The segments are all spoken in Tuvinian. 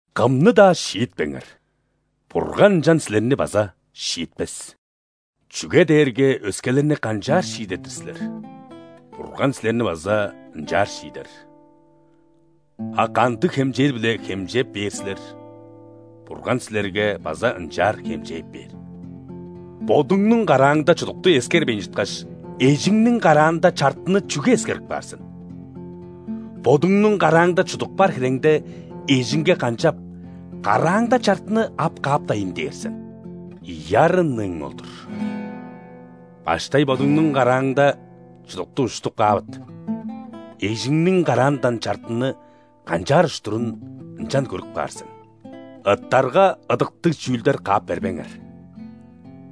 «Кымны-даа шиитпеңер, Бурган ынчан силерни база шиитпес. Чүге дээрге өскелерни канчаар шиидер-дир силер, Бурган силерни база ынчаар шиидер, а кандыг хемчээл-биле хемчээп бээр силер, Бурган силерге база ынчаар хемчээп бээр. Бодуңнуң карааңда чудукту эскербейн чыткаш, эжиңниң караанда чартыны чүге эскерип каар сен? Бодуңнуң карааңда чудук бар хиреңде, эжиңге канчап: „Карааңда чартыны ап кааптайн“ – дээр сен? Ийи арынныың ол-дур! Баштай бодуңнуң карааңда чудукту уштуп каавыт, эжиңниң караандан чартыны канчаар уштурун ынчан көрүп каар сен. Ыттарга ыдыктыг чүүлдер каап бербеңер,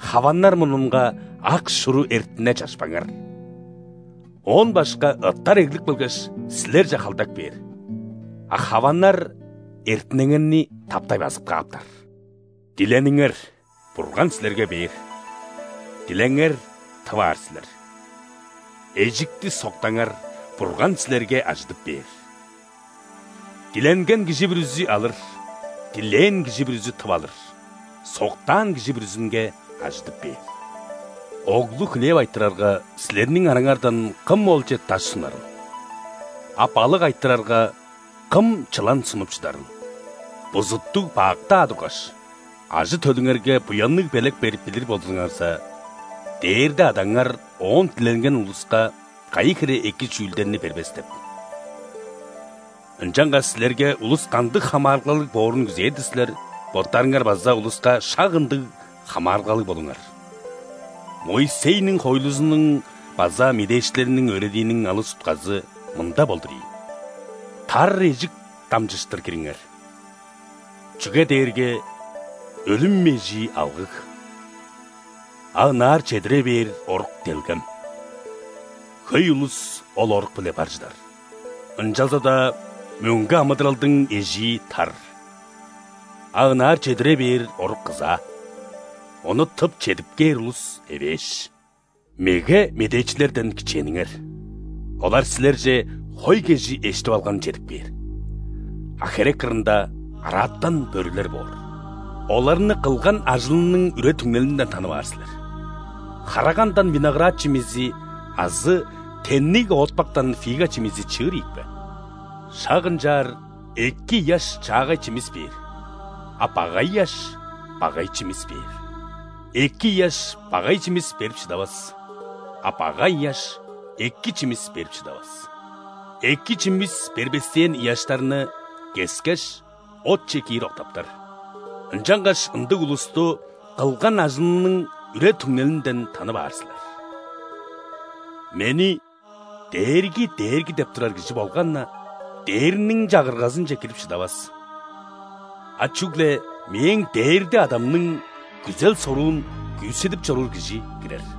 хаваннар мурнунга ак шуру эртине чашпаңар. Оон башка ыттар эглип келгеш, силерже халдап кээр, а хаваннар эртинеңерни таптай базып кааптар». «Дилениңер, Бурган силерге бээр; дилеңер, тып аар силер; эжикти соктаңар, Бурган силерге ажыдып бээр. Диленген кижи бүрүзү алыр, дилээн кижи бүрүзү тып алыр, соктаан кижи бүрүзүнге ажыдып бээр. Оглу хлеб айтырарга, силерниң араңардан кым олче даш сунарыл? А балык айтырарга, кым чылан сунуп чыдарыл? Бузуттуг-бак-даа тургаш, ажы-төлүңерге буянныг белек берип билир болзуңарза, дээрде Адаңар Оон диленген улуска кайы хире эки чүүлдерни бербес деп! Ынчангаш силерге улус кандыг хамаарылгалыг боорун күзээр-дир силер, боттарыңар база улуска шак ындыг хамаарылгалыг болуңар. Моисейниң хоойлузунуң база медээчилерниң өөредииниң алыс утказы мында болдур ийин». «Тар эжик дамчыштыр кириңер, чүге дээрге өлүм эжии алгыг, а ынаар чедире бээр орук делгем, хөй улус ол орук-биле бар чыдар. Ынчалза-даа мөңге амыдыралдың эжии тар, а ынаар чедире бээр орук кызаа, ону тып чедип кээр улус эвээш». «Меге медээчилерден кичээниңер. Олар силерже хой кежи эштип алган чедип кээр, а херек кырында араатан бөрүлер боор. Оларны кылган ажылының үре-түңнелинден танып аар силер. Харагандан виноград чимизи азы тенниг оотпактан фига чимизи чыыр ийикпе? Шак ынчаар эки ыяш чаагай чимис бээр, а багай ыяш багай чимис бээр. Эки ыяш багай чимис берип шыдавас, а багай ыяш эки чимис берип шыдавас. Эки чимис бербестээн ыяштарны кескеш, отче киир октаптар. Ынчангаш ындыг улусту кылган ажылының үре-түңнелинден танып аар силер. Мени: „Дээрги! Дээрги!“ – деп турар кижи болган-на Дээрниң Чагыргазынче кирип шыдавас, а чүгле Мээң Дээрде Адамның күзел-соруун күүседип чоруур кижи кирер.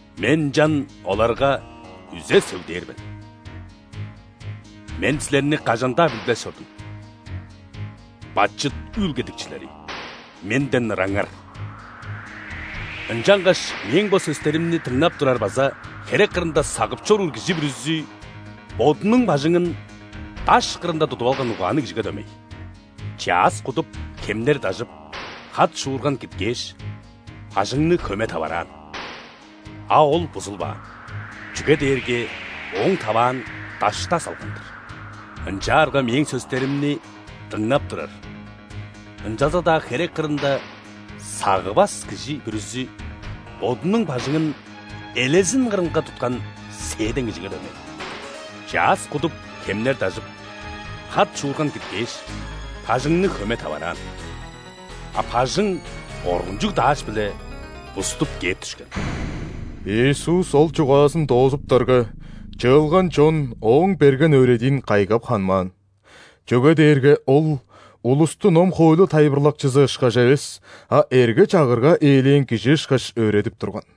Мен ынчан оларга үзе сөглээр мен: „Мен силерни кажан-даа билбес чордум. Бачыт үүлгедикчилери, Менден ыраңар!“» «Ынчангаш Мээң бо сөстеримни дыңнап турар база херек кырында сагып чоруур кижи бүрүзү бодунуң бажыңын даш кырынга тудуп алган угаанныг кижиге дөмей. Чаъс кудуп, хемнер дажып, хат-шуурган киткээш, бажыңны хөме тавараан. А ол бузулбаан, чүге дээрге ооң таваан дашта салган-дыр. Ынчаарга Мээң сөстеримни дыңнап турар, ынчалза-даа херек кырында сагывас кижи бүрүзү бодунуң бажыңын элезин кырынга туткан сээдең кижиге дөмей. Чаъс кудуп, хемнер дажып, хат-шуурган киткээш, бажыңны хөме тавараан. А бажың коргунчуг дааш-биле буступ кээп дүшкен». Иисус ол чугаазын доозуптарга, чыылган чон Ооң берген өөредиин кайгап ханмаан. Чүге дээрге Ол улусту ном-хоойлу тайылбырлакчызы ышкаш эвес, а эрге-чагырга ээлээн кижи ышкаш өөредип турган.